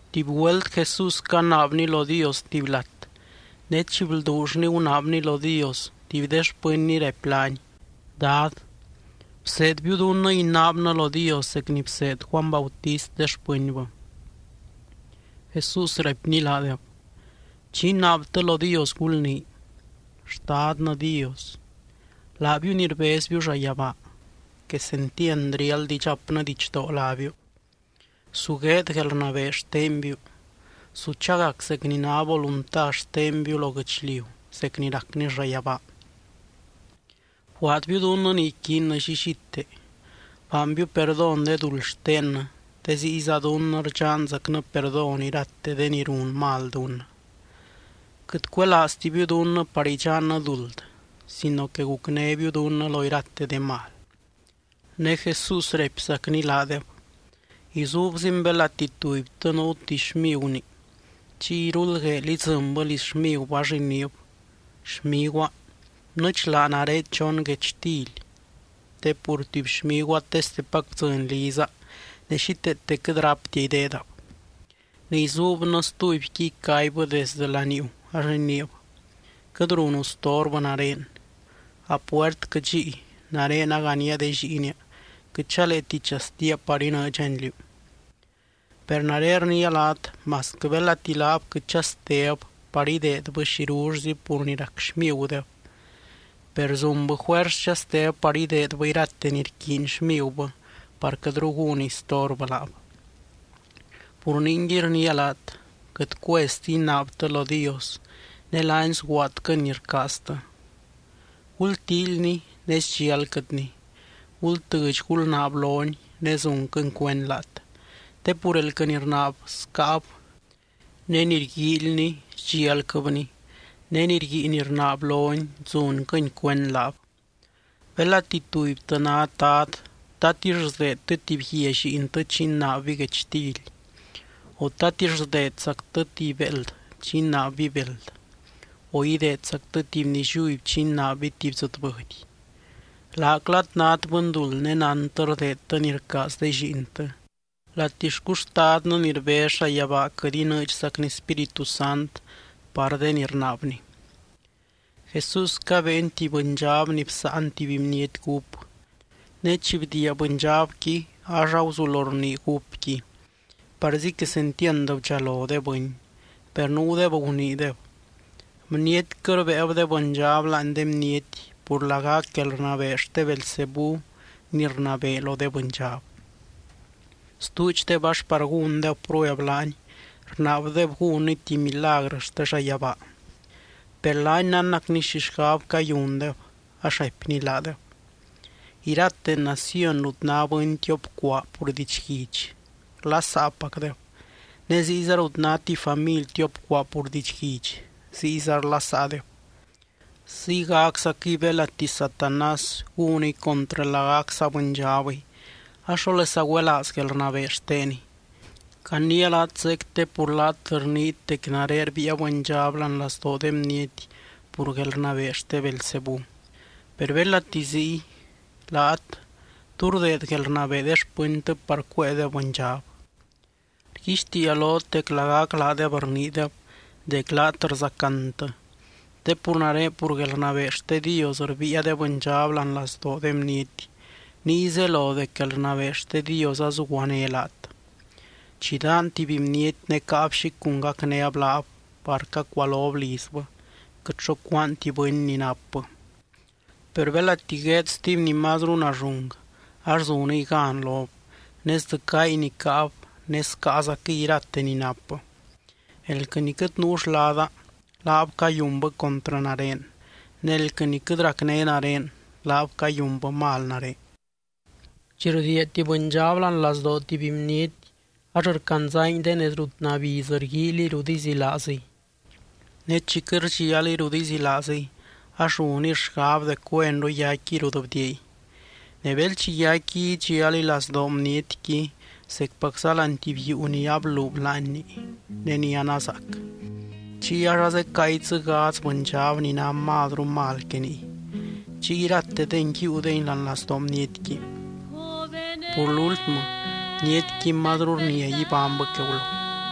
Tuby güelt Jesús canaabny lo Dios tuby lat, ne chi blduullny gunaabny lo Dios, tuby de xpɨnny raipy laany: —Dad, bseedbiu dunnɨ inaabnɨ lo Dios zec ni bseed Juany Bautist de xpɨnbɨ. Jesús raipny laadeb: —Chi inaabtɨ lo Dios gulnii: Xtadnɨ Dios, laabiu ni rbezbiu llayabaa Quesentiand riáld idxapnɨ didxdoo lábiu Su gueed guelrnabee xtenbiu. Su chagac zec ni ná volunta xtenbiu lo guɨchliu zec ni racni llayabaa. Bguaadbiu dunnɨ ni iquiinnɨ llillite. Baanbiu perdón de duld xtennɨ, te ziyza dunnɨ rdxanzacnɨ perdón irate de ni run mal dunnɨ. Quɨt cuelaaztibiu dunnɨ par idxannɨ duld sino que gucnébiu dunnɨ lo irate de mal. Ne Jesús raipzacni laadeb: —Izuubzin belati tubytɨ nuu tuby xmiguni. Chiy iruldgueel idzɨnbɨ liz xmigubɨ ax iniib: “Xmiguaa, bnɨdxlaa nare chon guechtily te pur tuby xmiguaa testepac bdzɨny liza, ne xíteete quɨt ráptia ideedab.” Ne izuubnɨ stubyqui icaibbɨ desdɨ laniuu ax iniib: “Quɨt runu storbɨ nare. A puertquɨ dxíi. Nare naganía de lliinia. Quɨt chaleeti chastia par inɨɨdxani liú.” Per nare rniia laat, masquɨ belati laab quɨt chasteb par ideedbɨ xirullzi pur rac xmigudeb, per zunbɨ juers chasteb par ideedbɨ irate ni rquiiny xmigubɨ par quɨtru gúniy storbɨ laab. Pur ningui, rniia laat: Quɨt cuezti inaabtɨ lo Dios ne laany sguaadquɨny ni rcaaztɨ. Gultíilyny ne sdxialquɨtny. Gultɨdx gulnaab lony, ne zunquɨny cuend laat. Te pur elquɨ ni rnaab, scáab. Ne ni rguíilny, sdxialquɨbny. Ne ni rguiiny rnaab lony zunquɨny cuend laab. ’Belati tubytɨ nát dad, ¿tatix sdeedtɨ tuby guia lliintɨ chi inaabby guechtily? ¿O tatix sdeedzactɨ tuby béeld chi inaabby beld? ¿O ideedzactɨ tuby nilliuby chi inaabby tuby dzɨtbɨdy? Laaclat nát bɨnduld ne nántɨ rdeedtɨ ni rcaaz de lliintɨ, ¡latixcu Xtadnɨ ni rbez llayabaa quɨt inɨɨdxacny Spíritu Sant par de ni rnaabny! Jesús cabeeny tuby bɨndxab ni bsáan tuby bniety gúp. Ne chi bdiia bɨndxabqui, ax aguzulo rnii gúpqui. Parzi quesentiand bdxalo de bɨny. Per nuudeb guniideb: —Bnietquɨ rbéeb de bɨndxab láani de bniety pur lagac guelrnabee xte Beelzebú ni rnabee lo de bɨndxab. Stuudxdeb ax par gúndeb prueb laany, rnaabdeb gúnny tuby milagrɨ xte llayabaa. Per laany nánnacny xi xgab cayundeb, ax raipny laadeb: —Irate naciony rut ná bɨny tiop cuaa pur didxguidx, rlasaapacdeb ne ziyza rut ná tuby family tiop cuaa pur didxguidx, ziyza rlasaadeb. Ziygaczaquɨy belati Satanás gúniy contrɨ lagac saa bɨndxabɨy ax, ¿xólesa güelaaz guelrnabee xteniy? Caniia laat zeec te pur laat rniit dec nare rbiia bɨndxab láani lazdoo de bniety pur guelrnabee xte Beelzebú. Per belati ziy, laat, ¿tú rdeed guelrnabee de xpɨntɨ par cuéedeb bɨndxab? Rguixtiia lot dec lagac laadeb rniideb dec laat rzacantɨ. Te pur nare pur guelrnabee xte Dios rbiia de bɨndxab láani lazdoo de bniety, niy zelo dec guelrnabee xte Dios azuguané laat. ’Chi daan tuby bniety ne caab xi cun gacnéb laab par cacualob lizbɨ, quɨt xo cúaanti bɨny ni napbɨ. Per belati gueed stuby ni mazru nallung ax zuniy gan lob, ne sdzɨcáy ni caab ne scaazaquɨy irate ni napbɨ. ’Elquɨ ni quɨt nuu xlada, laab cayunbɨ contrɨ nare. Ne elquɨ ni quɨt racné nare, laab cayunbɨ mal nare. ’Chi rdiia tuby bɨndxab láani lazdoo tuby bniety, ax rcandzangui de nez rut nabiz rguíiliy rut izilaaziy. Ne chi quɨt rdxialiy rut izilaaziy ax runiy xgab dec güenru yaicquiy rut bdiiay. Ne bel chi yaicquiy idxialiy lazdoo bnietqui zecpac láani tuby yuu ni ablub láanni, ne ni anazaac. Chiy ax azecáangui dzɨ gadz bɨndxab ni ná mazru mal que niy. Chiy iratedengui yiiudengui láani lazdoo bnietqui. Pur lúltmɨ, bnietqui mazru rnia ibánybɨ que gulo.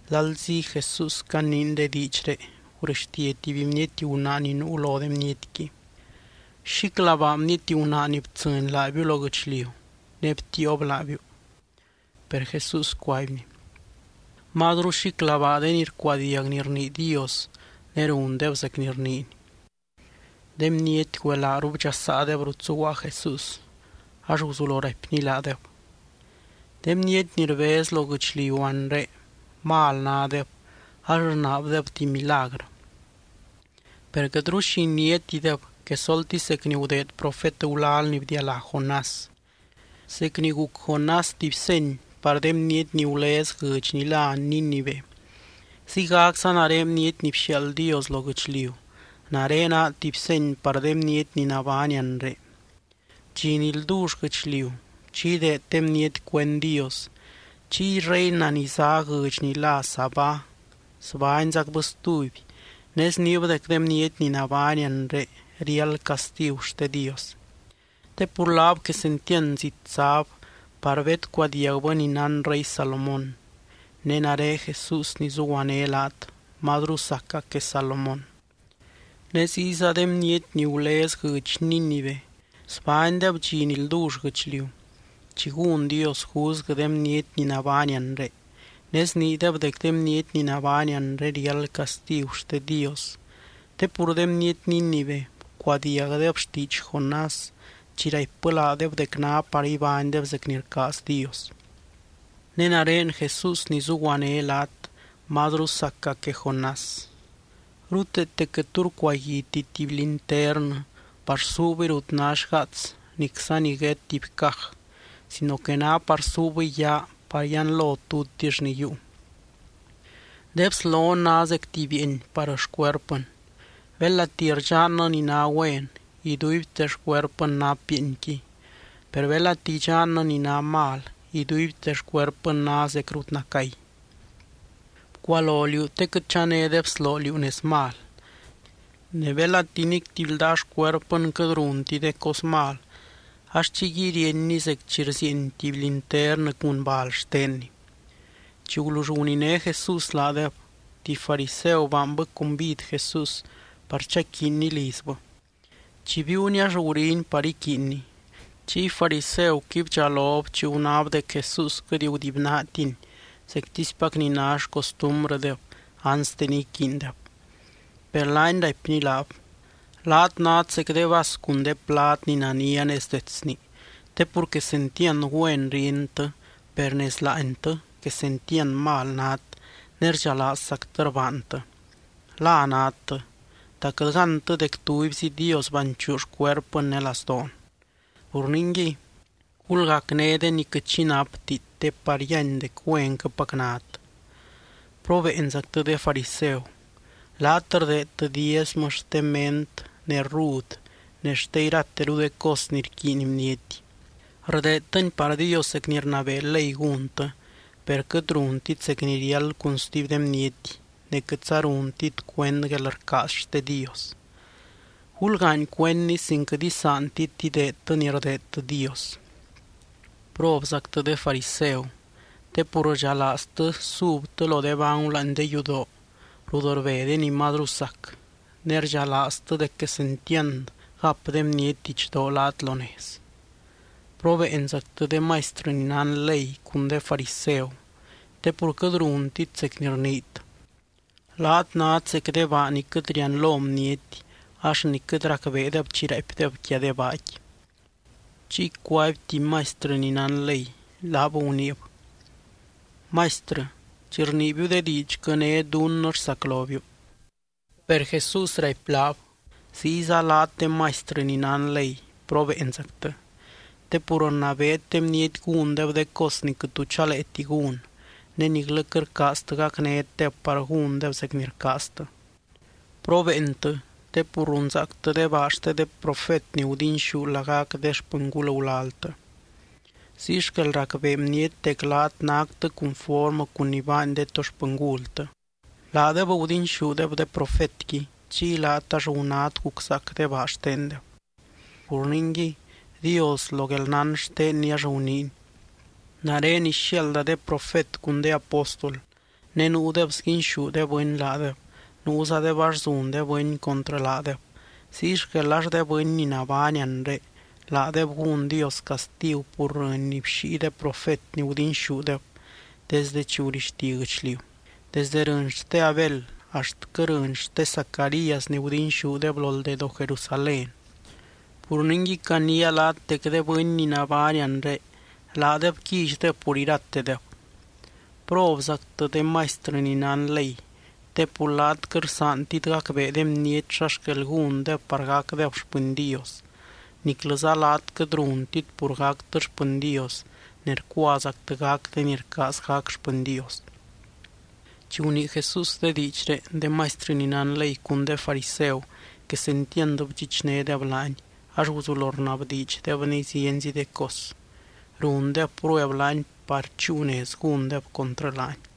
Lalzi Jesús caniiny de diidxré, gurɨxtia tuby bniety gunaa ni nuu lo de bnietqui: —¡Xíclabaa bniety gunaa ni btsɨny laabiu lo guɨchliu ne btiiob laabiu! Per Jesús cuaibny: —¡Mazru xíclabaa de ni rcuadiag ni rnii Dios ne rundeb zec ni rniiny! De bniety güelaaru bdxasaadeb rut zuguaa Jesús ax guzulo raipny laadeb: —De bniety ni rbez lo guɨchliu anre, mal nádeb ax rnaabdeb tuby milagrɨ. Per quɨtru xi iniátideb, quesoltisy zec ni gudeed profet gulal ni bdialá Jonás. Zec ni guc Jonás tuby seny par de bniety ni gulez guɨdx ni lá Nínive, ziygacza nare Bniety ni bxiaald Dios lo guɨchliu, nare naa tuby seny par de bniety ni nabány anre. Dxi ni ldull guɨchliu, chi ideed de bniety cuend Dios, chiy reina ni zá guɨdx ni lá Sabá sbányzacbɨ stuby ne sniib dec de bniety ni nabány anre riáld castigu xte Dios. Te pur laab quesentiand zit záb par bedcuadiagbɨ ni nán rey Salomón. Ne nare Jesús ni zuguané laat, mazru saca que Salomón. Ne ziyza de bniety ni gulez guɨdx Nínive sbánydeb dxi ni ldull guɨchliu, chi gún Dios juzguɨ de bniety ni nabány anre, ne sniideb dec de bniety ni nabány anre riáld castigu xte Dios. Te pur de bniety Nínive bcuadiagdeb xtiidx Jonás chi raipbɨ laadeb dec ná par ibánydeb zec ni rcaaz Dios. Ne nare Jesús ni zuguané laat mazru saca que Jonás. ’Ruteete quɨt tu rcuaguiti tuby linternɨ par suubɨy rut ná xgaats nicza niguét tuby caj, sino que ná par suubɨy yaa par yianlo tutix ni yiiu. De bslon ná zec tuby bieeny par xcuerpɨn. Belati rdxannɨ ni ná güen, iduibte xcuerpɨn nap bieenqui. Per belati idxannɨ ni ná mal, iduibte xcuerpɨn ná zec rut nacay. Bcualo liú te quɨt chané de bsloo liú nez mal. Ne belati nic tuby ldaa xcuerpɨn quɨt runti de cos mal ax chiyguiy ríenni zec chi rzieeny tuby linternɨ cun bal xtenni. Chi gulull guniné Jesús laadeb, tuby fariseu baanbɨ cumbid Jesús par chaquiinny lizbɨ. Chi biiuny ax guriny par iquiinny, chiy fariseuqui bdxalob chi gunáb dec Jesús quɨt gudibynaatiny zectispac ni ná xcostumbrɨdeb anste ni iquiindeb. Per laany raipny laab: —Laat nát zec de vas cun de plad ni nania nez detsni te pur quesentiand güen ríentɨ. Per nez láantɨ, quesentiand mal nát ne rdxalaazzactɨ rbaantɨ. ¡La nadtɨ! ¿Ta quɨt gántɨ dec tubyzi Dios banchuu xcuerpɨn ne lazdoon? Pur ningui gulgacné de ni quɨt xi napti te par yíany dec güenquɨpac nát. ’¡Probeenzactɨ, de fariseu! Laat rdeedtɨ diezmɨ xte ment ne rrud ne xte irateru de cos ni rquiiny bniety, rdeedtɨni par Dios zec ni rnabee ley gúntɨ. Per quɨt runtit zec ni riáld cun stuby de bniety ne quɨtza runtit cuend guelrcaaz xte Dios. Gulgaany cuendni sin quɨt isaantit ideedtɨ ni rdeedtɨ Dios. ’¡Probzactɨ, de fariseu! Te pur rdxalaaztɨ subtɨ lo de bangu láani de yudoo rut rbe de ni mazru sac, ne rdxalaaztɨ dec quesentiand gap de bniety didxdoo laat lo nez. ’¡Probeenzactɨ, de maistrɨ ni nán ley cun de fariseu, te pur quɨt runtit zec ni rniit! Laat nát zec de baa ni quɨt rianlo bniety ax ni quɨt racbeedeb chi raaipdeb quia de baaqui. Chiy cuaby tuby maistrɨ ni nán ley, laab guniib: —Maistrɨ, chi rniibiu de diidxquɨ né dunnɨ rsaclobiu. Per Jesús raipy laab: —¡Ziyza laat, de maistrɨ ni nán ley, probeenzactɨ! Te pur rnabeet de bniety gúndeb de cos ni quɨt tu chaleeti gún, ne niclɨ quɨt rcaaztɨ gacnétdeb par gúndeb zec ni rcaaztɨ. ’¡Probeentɨ!, te pur runzaactɨ de baa xte de profet ni gudinxú lagac de xpɨngul gulaltɨ. Ziy xquel racbee bniety dec laat náctɨ cunformɨ cun ni baany de to xpɨngultɨ. Laadeb gudinxúdeb de profetqui. Chiy laat ax gunát guczaac de baa xtendeb. ’Pur ningui, Dios lo guelnán xtenny ax guniiny: “Nare ixiaalda de profet cun de apóstol, ne nuudeb sguinxú de bɨny laadeb, nuuzadeb ax zun de bɨny contrɨ laadeb.” Ziy xquel ax de bɨny ni nabány anre, laadeb gún Dios castigu pur rɨny ni bxíi de profet ni gudinxúdeb desde chi gurixti guɨchliu, desdɨ rɨny xte Abel axtquɨ rɨny xte Zacarías ni gudinxúdeb lo ldedoo Jerusalén. Pur ningui caniia laat dec de bɨny ni nabány anre laadeb quillydeb pur iratedeb. ’¡Probzactɨ, de maistrɨ ni nán ley!, te pur laat quɨt rsaantit gacbee de bniety xa xquel gúndeb par gacdeb xpɨny Dios, niclɨza laat quɨt runtit pur gactɨ xpɨny Dios ne rcuazactɨ gac de ni rcaaz gac xpɨny Dios. Chi gunii Jesús de diidxré, de maistrɨ ni nán ley cun de fariseu quesentiand bdxichnédeb laany, ax guzulo rnabdiidxdebny zienzi de cos. Rundeb prueb laany par chúu nez gúndeb contrɨ laany.